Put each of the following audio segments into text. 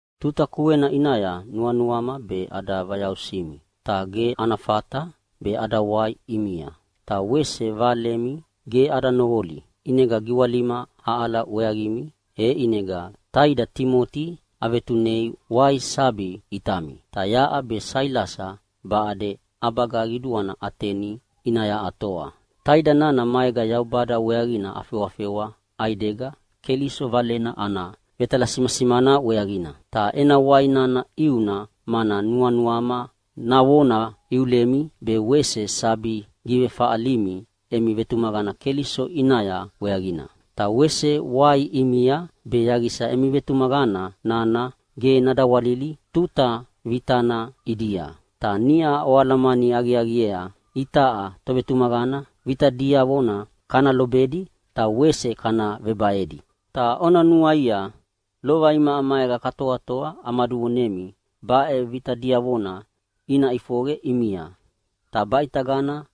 Tuta kuena ʼinaya nuanuama be ada vayausimi, ta ge ana fata be ada wai ʼimia. Ta wese valemi ge ada noqoli, ʼinega giwalima aʼala weaqimi. E ʼinega taida Timoti avetunea wai sabi ʼitami, ta yaʼa be Sailasa baʼade ʼabaga qiduana Ateni ʼinaya atoa. Taida nana maega Yaubada weaqina afewafewa ʼaidega Keliso Valena ana vetalasimasimana weaqina. Ta ena wai nana ʼiuna mana nuanuama navona iulemi, be wese sabi givefaʼalimi emi vetumaqana Keliso ʼinaya weaqina. Ta wese wai ʼimia be yaqisa emi vetumaqana nana ge nadawalili tuta vitana ʼidia. Ta niʼa oalamani aqiaqiea itaʼa tovetumaqana vita diavona kana lobedi ta wese kana vebaedi. Ta ona nuaia lova imaʼa maega katoatoa amaduvonemi baʼe vita diavona ina ʼifoqe ʼimia, ta baʼitagana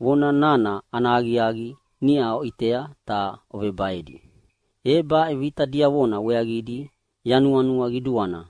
vona nana ana aqiaqi niʼa oʼitea ta ovebaedi. E baʼe vita diavona weaqidi yanuanua qiduana,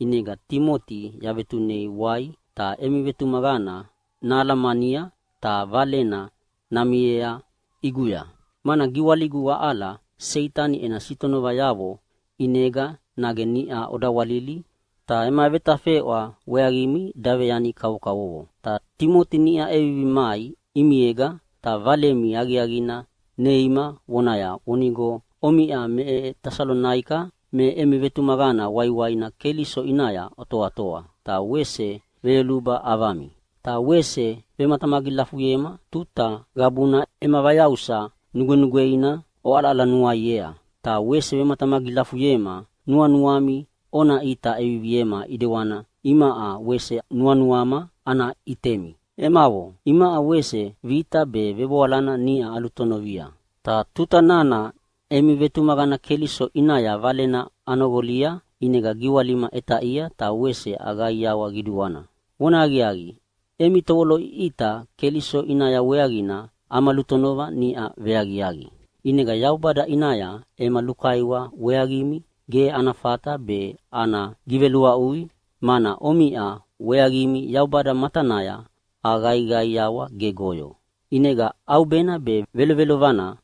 ʼinega Timoti yavetunei wai ta emi vetumaqana nahalamania ta valena namiea ʼiguya. Mana giwaligu aʼala Seitani ena sitonovayavo ʼinega nage niʼa odawalili ta ema vetafeʼwa weaqimi daveyani kavokavovo. Ta Timoti niʼa ʼevivi mai ʼimiega ta valemi aqiaqina neima vonaya vonigo omiʼa me Tesalonaika me emi vetumaqana waiwaina Keliso ʼinaya otoatoa ta wese veyoluba ʼavami. Ta wese vematamagilafuyema tuta qabuna ema vayausa nugwenugweina oʼalaʼalanuaiea, ta wese vematamagilafuyema nuanuami ona ʼita ʼeviviema ʼidewani imaʼa wese nuanuama ana ʼitemi. Emavo, imaʼa wese vita be vevoalana niʼa alutonovia, ta tuta nana emi vetumaqana Keliso ʼinaya valena anoqolia ʼinega giwalima ʼetaʼia ta wese aqaiawa qiduana. Vona aqiaqi, emi tovoloʼiʼita Keliso ʼinaya weaqina ama lutonova niʼa veaqiaqi. ʼInega Yaubada ʼinaya ema lukaiwa weaqimi ge ana fata be ana giveluaʼui, mana omiʼa weaqimi Yaubada matanaya aqaiqaiawa gegoyo. ʼInega ʼaubena be velovelovana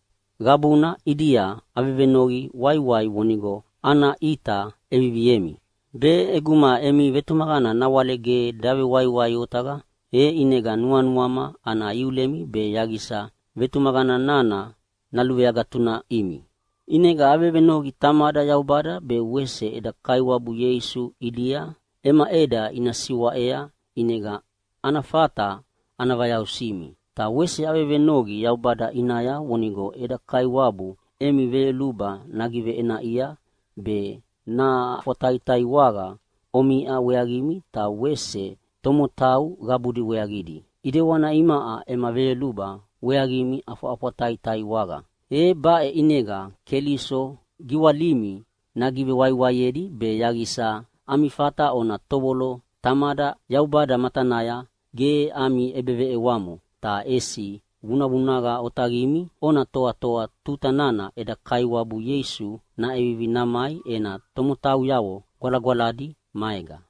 qabuna ʼidia avevenoqi waiwai vonigo ana ʼita ʼeviviemi, be ʼeguma emi vetumaqana nawale ge davewaiwai otaqa, e ʼinega nuanuama ana iulemi be yaqisa vetumaqana nana naluveagatunaʼimi. ʼInega avevenoqi Tamada Yaubada be wese eda Kaiwabu Ieisu ʼidia ema ʼeda ina siwaʼea ʼinega ana fata ana vayausimi. Ta wese avevenoqi Yaubada ʼinaya vonigo eda Kaiwabu emi veyoluba nagiveʼenaʼia be naʼafwataiwaqa omiʼa weaqimi ta wese tomotau qabudi weaqidi, ʼidewani imaʼa ema veyoluba weaqimi ʼafwaʼafwataiwaqa. E baʼe ʼinega Keliso giwalimi nagivewaiwaiedi be yaqisa ami fata ona tovolo Tamada Yaubada matanaya ge ami ʼebeveʼewamo, ta ʼesi vunavunaqa otaqimi ona toatoa tuta nana eda Kaiwabu Ieisu naʼevivi namai ena tomotauyavo gwalagwaladi maega.